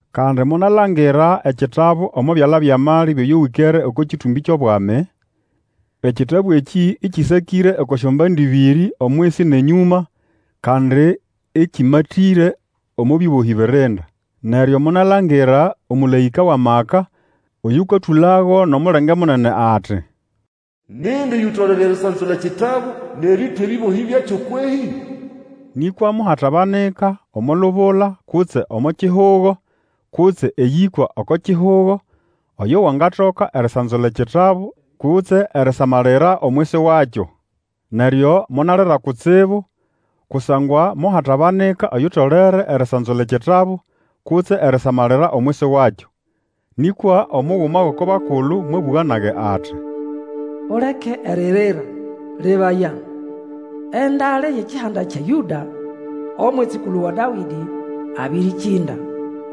Kandi monalangira ekitabu omo byala byʼamali byʼoyo wĩkere oko kĩtũmbĩ kyʼobwami. Ekitabu ekĩ Ĩkĩsakĩre oko syombande ĩbĩrĩ, omwisi nʼenyũma, kandi ĩkĩmatĩre omo bĩbohĩ birinda. Neryo monalangira omũlaĩka wʼamaka oyũkatũlago nʼomulenge munene ati, Nindi oyutolere erisanzula ekitabu nʼerĩtwa ebĩbohĩ byakyo kwehĩ? Nĩkwa mohatabanika omo lubula kutse omo kihugo, kutse eyĩkwa oko kihugo, oyo wangatoka erisanzula ekĩtabu kutse erisamalira omwisi wakyo. Neryo monalira kutsibu kusangwa mohatabanika oyutolere erisanzula ekitabu kutse erisamalira omwisi wakyo. Nĩkwa omuguma gʼoko bakulu mwabũga nage ati, Uleke eririra, lebaya! Endale yʼekihanda kya Yũda, Omwitsikulu wa Dawĩdĩ, abĩrĩkĩnda,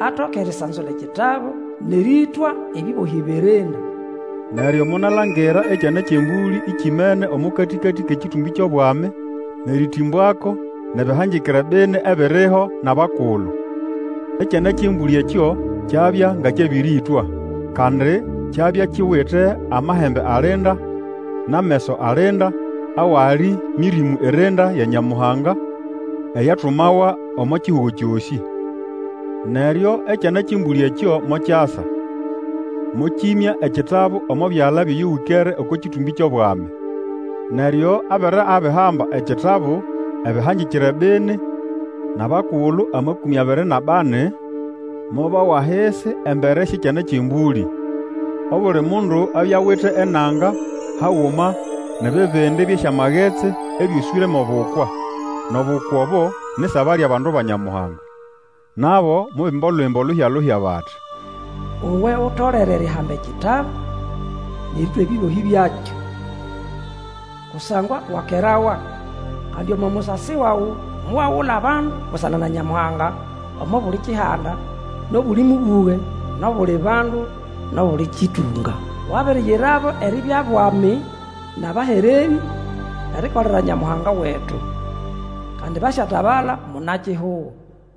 atoke erisanzula ekitabu, nʼerĩtwa ebĩbohĩ birinda. Neryo monalangira Ekyana kyʼEmbũlĩ ekimene omo katĩkatĩ kʼekĩtũmbĩ kyʼobwami nʼerĩtĩmbwako nʼebĩhangĩkĩre bini ebiriho nʼabakulu. Ekyana kyʼEmbũlĩ ekyo kyabya nga kyabĩrĩĩtwa. Kandi kyabya kiwite amahembe alinda nʼameso alinda, awali Mĩrĩmũ irinda ya Nyamuhanga, eyatumawa omo kihugo kyosĩ. Neryo Ekyana kyʼEmbũlĩ ekyo mokyasa, mokyĩmya ekitabu omo byala byʼoyo wĩkere oko kĩtũmbĩ kyʼobwami. Neryo abere abihamba ekitabu, ebĩhangĩkĩre bini nʼabakulu amakũmĩ abiri nʼabani mobawa ahisi embere syʼEkyana kyʼEmbũlĩ. Obuli mundu abya awite enanga haguma nʼebibindi byʼesyamagetsi ĩbyoswĩre mwʼobukwa, nʼobukwa obo ni ʼsaba lyʼabandu ba Nyamuhanga. Nabo mobimba Olwimbo luhya-luhya bati, Uwe utolere erihamba ekitabu Nʼerĩtwa ebĩbohĩ byakyo. Kusangwa wakerawa, kandi omo musasi wawe Mowagula abandu busana na Nyamuhanga, Omo buli kihanda, nʼobuli mũbũge, nʼobuli bandu, nʼobuli kĩtũnga. Wabiriyirabo eribya bwami, nʼabahererĩ, erikolera Nyamuhanga wetu. Kandi, basyatabala muna-kihugo.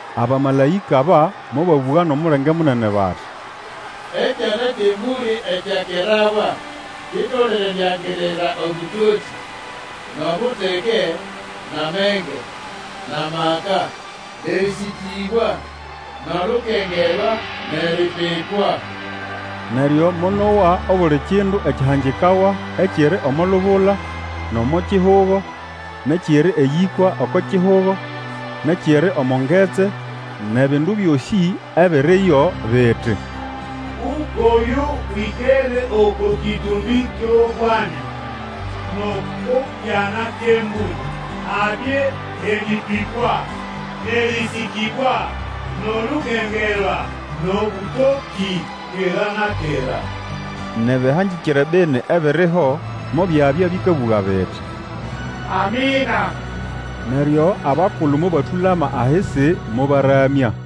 Abamalaĩka aba mobabũga nʼomulenge munene bati, Ekyana kyʼEmbũlĩ ekyakerawa kitolere Eriangirira obũtokĩ, nʼobuteke, nʼamenge, nʼamaka, Nʼerĩsĩkĩbwa, nʼolukengerwa, nʼeripipwa! Neryo monowa obuli kindu ekyahangikawa ekiri omo lubula, nʼomo kihugo, nʼekiri eyĩkwa oko kihugo, nʼekiri omo ngetsi, nʼebindu byosĩ ebiriyo, biti, Ukwʼoyo wĩkere oko kĩtũmbĩ kyʼobwami, Nʼoko Kyana kyʼEmbũlĩ, Habye eripipwa, nʼerĩsĩkĩbwa, nʼolukengerwa, nʼobũtokĩ, Kera na kera! Nʼebĩhangĩkĩre bini ebiriho, mobyabya bĩkabũga biti, Amina! Neryo abakulu mobatũlama ahisi, mobaramya.